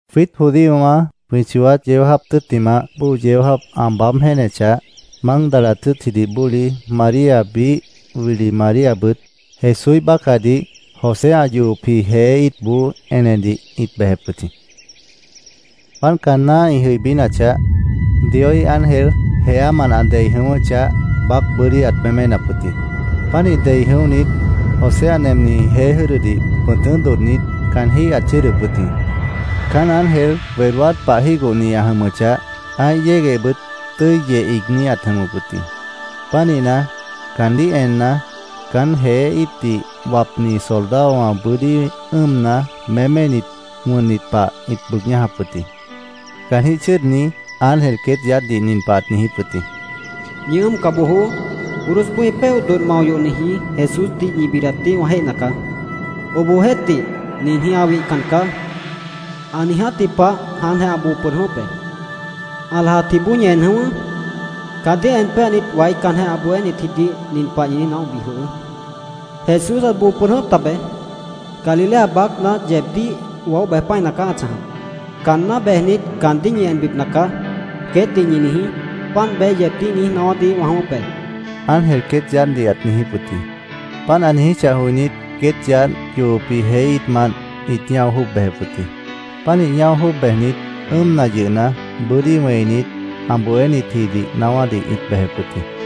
Jwiít judíowã jwĩ chooát yeó jáap tʉ́ttimah bóo yeó jáap ã baáb jéenechah, Mágdala tʉ́tchidih bóli María, biíh wili Maríabʉt Jesúíh bácahdih José ã yohopji jeé íitboó enedih ĩt bejep wʉt jĩ. Páant caanná ĩ jʉibínachah, Dioíh ángel jeámant ã dei jʉ̃ʉ́wʉ́chah, baác bʉ́dí ãt méménap wʉt jĩ. Pánih dei jʉ̃óhnit, José ã nemniji jeé jʉ́dʉdih pʉ̃tʉ́ dodhnit, caanjíh ãt chʉ́ʉdʉp wʉt jĩ. Caán ángel wedóát pah jígohni ã jʉmʉchah, ã́ih yéguehbʉt tʉ́i yeh iigní ãt jʉmʉp wʉt jĩ. Pánihna, caandíh enna, caán jeé íitdih wapnit soldadowã bʉ́dí ʉ́ʉmna, méménit, wʉnnit pah ĩt bʉʉg ñájap wʉt jĩ. Caanjĩ́h chʉ́ʉdni ángel queét yaádhdih nin pah ãt niijíp wʉt jĩ: —¡Ñi ʉ́ʉmca bojoó! Cruzboó ĩ péoh dodh mao yohniji Jesúsdih ñi bidatdih wã jéihna caá. Obohjeéhtih, ninjĩh ã wihcan caá. Ã niijátji pah jáantjeh ã boo pʉd jʉ̃ʉ́wʉ́p be. Ã lajapjiboó ñi en jʉ̃ʉ́wʉ́. Caandíh en péanit, waícanjeh ã bohénitjidih nin pah ñi niíj naóhbi jwʉhʉʉ́: ‘Jesús ãt boo pʉd jʉ̃ʉ́wʉ́p tabeé. Galilea baácna yeebdíh waóh bej pã́ina caá ã chãjap. Caanná bejnit, caandíh ñi enbipna caá’, queétdih ñi niijí. Páant beé yeebdíh niíj naáwádih wã jʉ̃ʉ́wʉ́p be, ángel queét yaádhdih ãt niijíp wʉt jĩ. Páant ã niijíchah joinít, queét yaádh yohopji jeé íitmant ĩt ñáo jwʉ́ʉb bejep wʉt jĩ. Pánih ñáo jwʉ́ʉb bejnit, ʉ́ʉmna yʉhna, bʉ́dí wẽinit, ã bohénitjidih naáwádih ĩt bejep wʉt jĩ.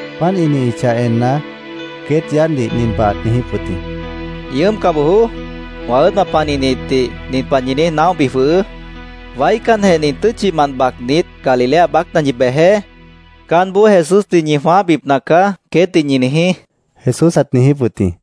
Páant ĩ chãjachah enna, queét yaádhdih nin pah ãt niijíp wʉt jĩ: —Ñi ʉ́ʉmca bojoó. Wã ʉ́ʉdwã panihnitdih nin pah ñi niíj naóhbi jwʉhʉʉ́: ‘Waícanjeh nin tʉ́tchimant bacnit, Galilea baácna ñi bejeé. Caánboó Jesúsdih ñi jwãáhbipna caá’, queétdih ñi niijí, Jesús ãt niijíp wʉt jĩ.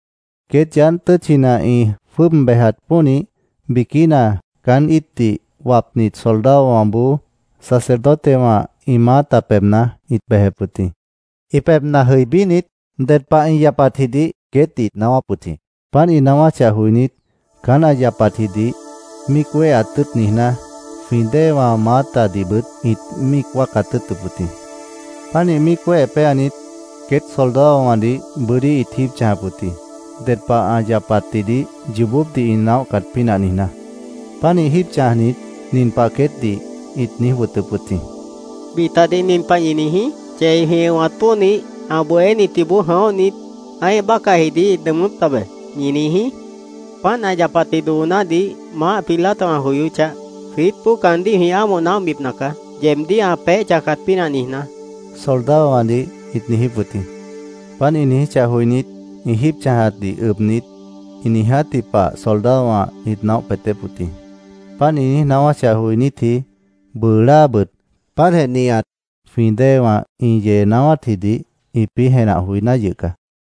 Queét yaádh tʉ́tchina ĩ jwʉ́ʉb bejat pónih, biquína caán íitdih wapnit soldadowãboó sacerdotewã ĩ maáta pebhna ĩt bejep wʉt jĩ. Ĩ pebhna jʉibínit, ded pah ĩ yapatjidih queétdih ĩt naáwáp wʉt jĩ. Páant ĩ naáwáchah joinít, caán ã yapatjidih míic wéheat tʉ́ʉt niijná, jwĩ déewã maátadihbʉt ĩt míic wáacat tʉ́ʉtʉp wʉt jĩ. Pánih míic wéhe péanit, queét soldadowãdih bʉ́dí ĩt jíib chãjap wʉt jĩ, ded pah ã yapatjidih yoobópdih ĩ naóhcat pínah niijná. Pánih jíib chãjnit, nin pah queétdih ĩt niíj wʉtʉp wʉt jĩ: —Bitadih nin pah ñi niijí: ‘Chei jwĩ ʉ̃wat pónih, ã bohénitjiboó jʉ̃óhnit, ã́ih bácahjidih ĩt nʉʉmʉ́p tabe’, ñi niijí. Páant ã yapatji doonádih Maáh Pilato ã joyóchah, jwiítboó caandíh jwĩ ámoh naóhbipna caá, yeebdíh ã peéh chãjcat pínah niijná, soldadowãdih ĩt niijíp wʉt jĩ. Páant ĩ niijíchah joinít, ĩ jíib chãjatdih ʉbnit, ĩ niijátji pah soldadowã ĩt naóh peetép wʉt jĩ. Páant ĩ niíj naáwáchah joinítji, bʉʉ láabʉt páantjeh nihat jwĩ déewã ĩ yee naáwátjidih ĩpĩ́ jenah joiná yʉh caá.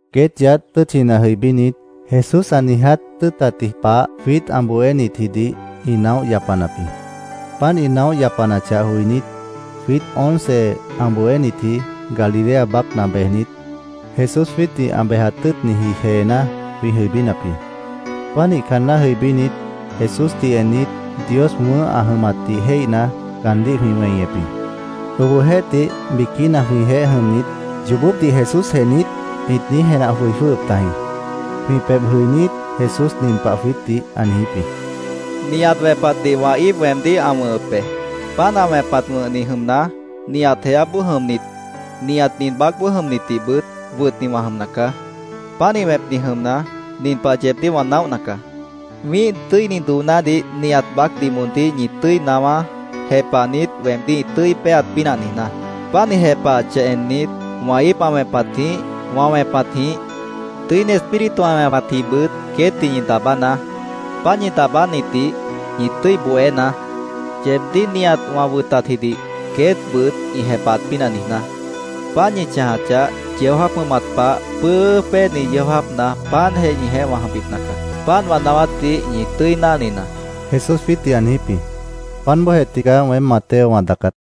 Queét yaádh tʉ́tchina jʉibínit, Jesús ã niiját tʉ́ʉtatji pah jwiít ã bohénitjidih ĩ naóh yapanap jĩ. Páant ĩ naóh yapanachah joinít, jwiít once ã bohénitji Galilea baácna bejnit, Jesús jwiítdih ã bejat tʉ́ʉtniji jeená jwĩ jʉibínap jĩ. Pánih caanná jʉibínit, Jesúsdih ennit, Dios wʉ̃ʉ́h ã jʉmatdih jéihna, caandíh jwĩ weñep jĩ. Obohjeéhtih, biquína jwĩjeéh jʉmnit “¿Yoobópdih Jesúsjeh niít?” ĩt niíj jenah joi jwʉ́hʉp tajĩ. Jwĩ pebh jʉinít, Jesús nin pah jwiítdih ã niijíp jĩ: —Nihat wẽpatdih wã íip weemdíh ã wʉ̃hʉp be. Páant ã wẽpat wʉ̃hni jʉmna, nihat jeáboó jʉmnit, nihat nin baácboó jʉmnitdihbʉt wʉtni wã jʉmna caá. Pánih wẽpni jʉmna, nin pah yeebdíh wã naóhna caá: Wĩ́ih tʉ́ini doonádih nihat baácdih moondíh ñi tʉ́i naáwá, jepahnit, weemdíh ĩ tʉ́i péeat pínah niijná. Páant ĩ jepahachah ennit, wã íip ã wẽpatjĩh, wã wẽpatjĩh, Tʉ́ini Espíritu ã wẽpatjĩhbʉt queétdih ñi daabánaá. Páant ñi daabánitdih ñi tʉ́i bohénaá, yeebdíh nihat wã wʉtatjidih queétbʉt ĩ jepahat pínah niijná. Páant ñi chãjachah, yeó jáap jʉmat pah pʉ́ʉ́ʉ́ péeni yeó jáapna páantjeh ñijeéh wã jʉmbipna caá. Páant wã naáwátdih ñi tʉ́i náhninaá, Jesús jwiítdih ã niijíp jĩ. Páant bóojeh tigaá weém Mateo wã daacát.